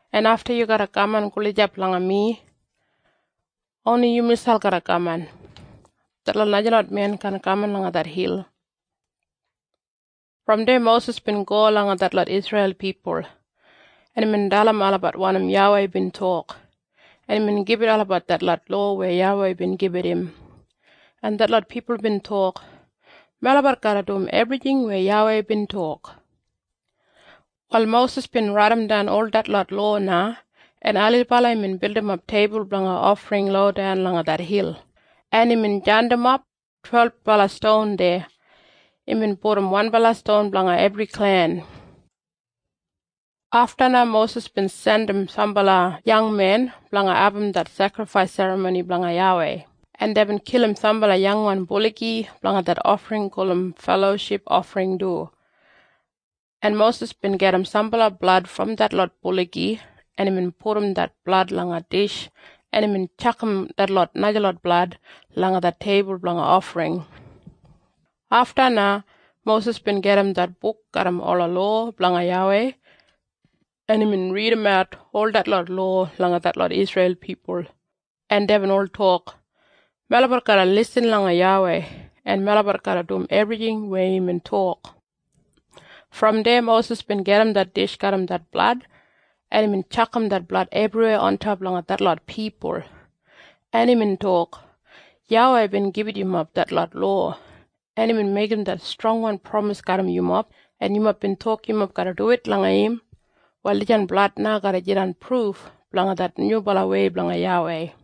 en afta yu garra kaman gulijap langa mi. Oni yu miselp garra kaman. Detlot najalot men kaan kaman langa det hil.” Brom deya Mosis bin go langa detlot Isreil pipul, en imbin dalim olabat wanim YAWEI bin tok, en imbin gibit olabat detlot lowa weya YAWEI bin gibit im, en detlot pipul bin tok, “Melabat garra dum ebrijing weya YAWEI bin tok.” Wal Mosis bin raidimdan ol detlot lowa na, en ailibala imbin bildimap teibul blanga ofring lodan langa det hil, en imbin jandimap twelbala ston deya. Imbin pudum wanbala ston blanga ebri klen. Afta na Mosis bin jandim sambala yangmen blanga abum det sekrifais serramoni blanga YAWEI, en deibin kilim sambala yangwan buligi blanga det ofring gulum feloship ofring du, en Mosis bin gajim sambala blad brom detlot buligi, en imbin pudum det blad langa dish, en imbin tjakam detlot najalot blad langa det teibul blanga ofring. Afta na Mosis bin gajim det buk garram ola lowa blanga YAWEI, en imbin ridimat ol detlot lowa langa detlot Isreil pipul, en deibin ol tok, “Melabat garra lisin langa YAWEI, en melabat garra dum ebrijing weya imbin tok.” Brom deya Mosis bin gajim det dish garram det blad, en imbin tjakam det blad ebriweya ontop langa detlot pipul, en imbin tok, “YAWEI bin gibit yumob detlot lowa, en imbin meigim det strongwan pramis garram yumob, en yumob bin tok yumob garra duwit langa im. Wal dijan blad na garra jidan pruf blanga det nyubalawei blanga YAWEI.”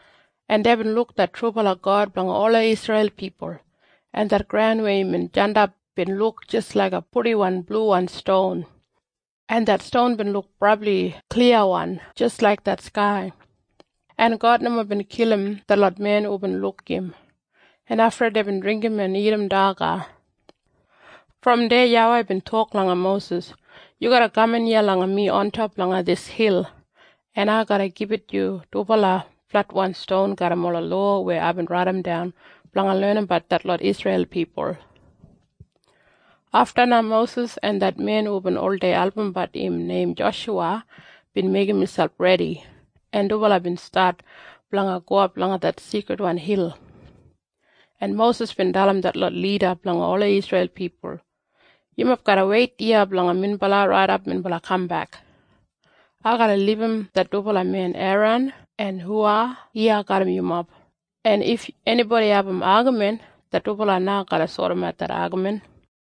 en deibin luk det trubala God blanga ola Isreil pipul, en det graun weya imbin jandap bin luk jis laiga purdiwan bluwan ston, en det ston bin luk brabli kliyawan jis laik det skai. En God nomo bin kilim detlot men hubin luk im, en afta deibin dringgim en dagat daga. Brom deya YAWEI bin tok langa Mosis, “Yu garra kaman iya langa mi ontop langa dis hil, en ai garra gibit yu dubala fletwan ston garram ola lowa weya aibin raidimdan blanga lenim detlot Isreil pipul.” Afta na Mosis en det men hubin oldei albumbat im neim Joshuwa bin meigim miselp redi, en dubala bin stat blanga gowap langa det seikridwan hil, en Mosis bin dalim detlot lida blanga ola Isreil pipul, “Yumob garra weit iya blanga minbala raidap minbala kambek. Ai garra libum det dubala men Eran en Huwa iya garram yumob, en if enibodi abum agamin, det dubala na garra sodimat det agamin.”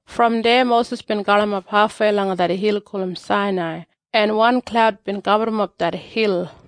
Brom deya Mosis bin galimap hafwei langa det hil gulum Sainai, en wan klaud bin gaburrumap det hil,